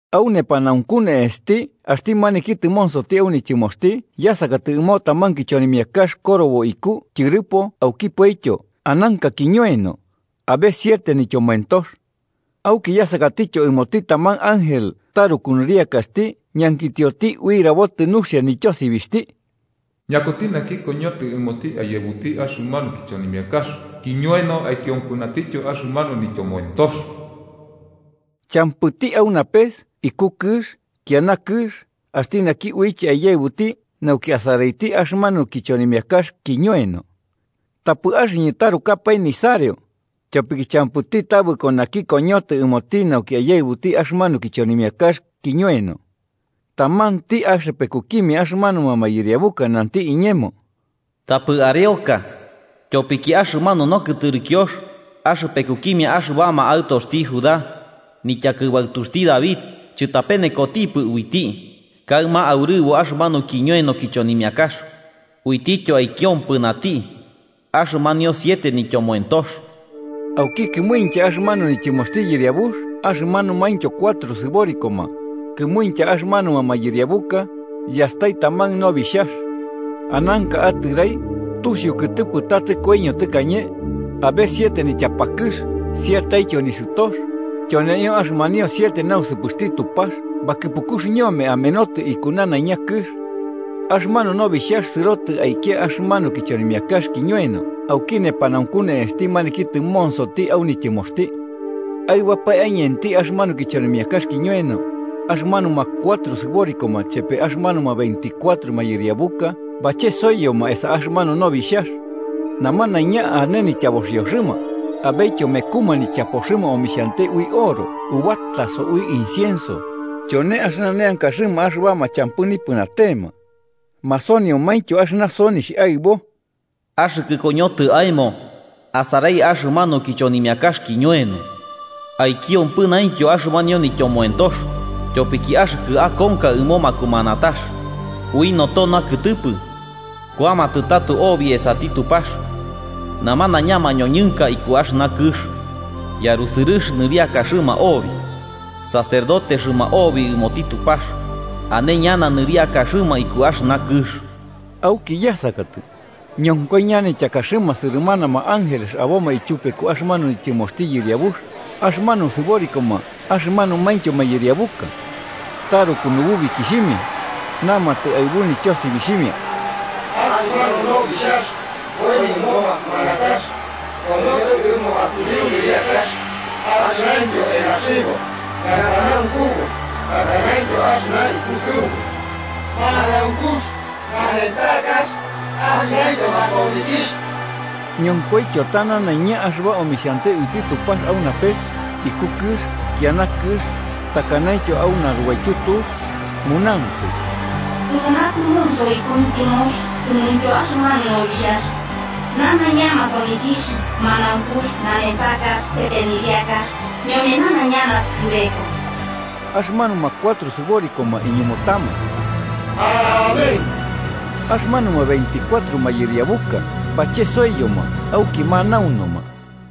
Au nepanaunku ne'esti axti maniki tɨmonsoti au nityɨmoxti yasakatɨ ɨmo taman kichonimiakax korobo iku tyɨrɨpo aukipoityo ananka kiñoeno, abe siete nityomoentox. Auki yasakatityo ɨmoti taman ángel taruku nɨriakaxti ñankitioti ui rabotɨ nuxia nityosibixhti: “¿Ñakuti naki koñotɨ ɨmoti aiyaɨbuti axɨmanu kichonimiakax kiñoeno aikiompɨnatityo axɨmanio nityomoentox?” Champɨti au napes iku kɨx kiana kɨx axti naki uiche aiyaɨbuti nauki asaraiti axɨmanu kichonimiakax kiñoeno. Tapɨ axɨñɨ tarukapae nisareo, tyopiki champɨti tabɨko naki koñotɨ ɨmoti nauki aiyaɨbuti axɨmanu kichonimiakax kiñoeno. Tamanti axɨpekukimia axɨmanuma mayɨriabuka nanti iñemo: “Tapɨ areoka, tyopiki axɨmanu Nokɨtɨrɨkiox axɨpekukimia axɨbama aɨtoxti Judá, nityakɨbaɨtuxti David chɨtapenekotipɨ uiti kaɨma aurɨbo axɨmanu kiñoeno kichonimiakax uitityo aikiompɨnati axɨmanio siete nityomoentox.” Auki kɨmuintya axɨmanu nityɨmoxti Yɨriabux axɨmanumaintyo cuatro sɨborikoma, kɨmuintya axɨmanuma mayɨriabuka, yastai taman nobixhax. Ananka atɨrai, tusiu kɨtɨpɨ ta tɨkoiño tɨkañe. Abe siete nityapakɨx sietetyo nisɨtox, tyoneio axɨmanio siete nausɨpɨxti Tupax bakɨpukux ñome amenotɨ iku nanaiña kɨx. Axɨmanu Nobixhax sɨrotɨ aikia axɨmanu kichonimiakax kiñoeno auki nepanaunku ne'esti maniki tɨmonsoti au nityɨmoxti. Aɨbapae aiñenti axɨmanu kichonimiakax kiñoeno, axɨmanuma cuatro sɨborikoma chepe axɨmanuma veinticuatro mayɨriabuka bachesoiyoma esa axɨmanu nobixhax. Namanaiña ane nityaboxioxɨma, abetyo mekuma nichapoxɨma omixhante ui oro ubataso ui incienso, tyone axɨna neankaxɨma axɨbama champɨ nipɨnatema. Masoniomaintyo axɨna sonixh aɨbo: “Axɨkɨ koñotɨ aemo asarai axɨmanu kichonimiakax kiñoeno aikiompɨnaintyo axɨmanio nityomoentox, tyopiki axɨkɨ akonka ɨmo makumanatax. Ui noto nakɨtɨpɨ kuamatɨ tato obi esati Tupax namanaiña mañoñɨnka ikuki axɨna kɨx. Yarusɨrɨx nɨriakaxɨma obi, sacerdotexɨma obi ɨmoti Tupax, ane ñana nɨriakaxɨma iku axɨna kɨx.” Auki yasakatɨ, ñonkoi ñanityakaxɨma sɨrɨmanama ángeles aboma tyupeku axɨmanu nityɨmoxti Yɨriabux, axɨmanuma sɨborikoma axɨmanumaintyo mayɨriabuka. Taruku nububikixhimia, namatɨ aɨbu nityosibixhimia: “¡Axɨmanu Nobixhax koiño ɨmo makumanatax koñotɨ ɨmo asuriu nɨriakax axɨnaintyo enaxibo, ñapanaunkubu takanaintyo axɨna ikusɨubu, manaunkux nanentakax axɨnaintyo masonikixh!” Ñonkoityo ta nanaiña axɨba omixhante uiti Tupax au napes, iku kɨx, kiana kɨx, takanaintyo au narubaityu tux, munantɨ: “¡Ɨmoti naki tɨmonsoti iku nityɨmoxti ɨmointyo axɨmanu Nobixhax, nanaiña masonikixh, manaunkux, nanentakax chepe nɨriakax ñome nanaiña naskɨbeka!” Axɨmanuma cuatro sɨborikoma iñumutama: “¡Amén!” Axɨmanuma veinticuatro mayɨriabuka bachesoiyoma auki manaunuma.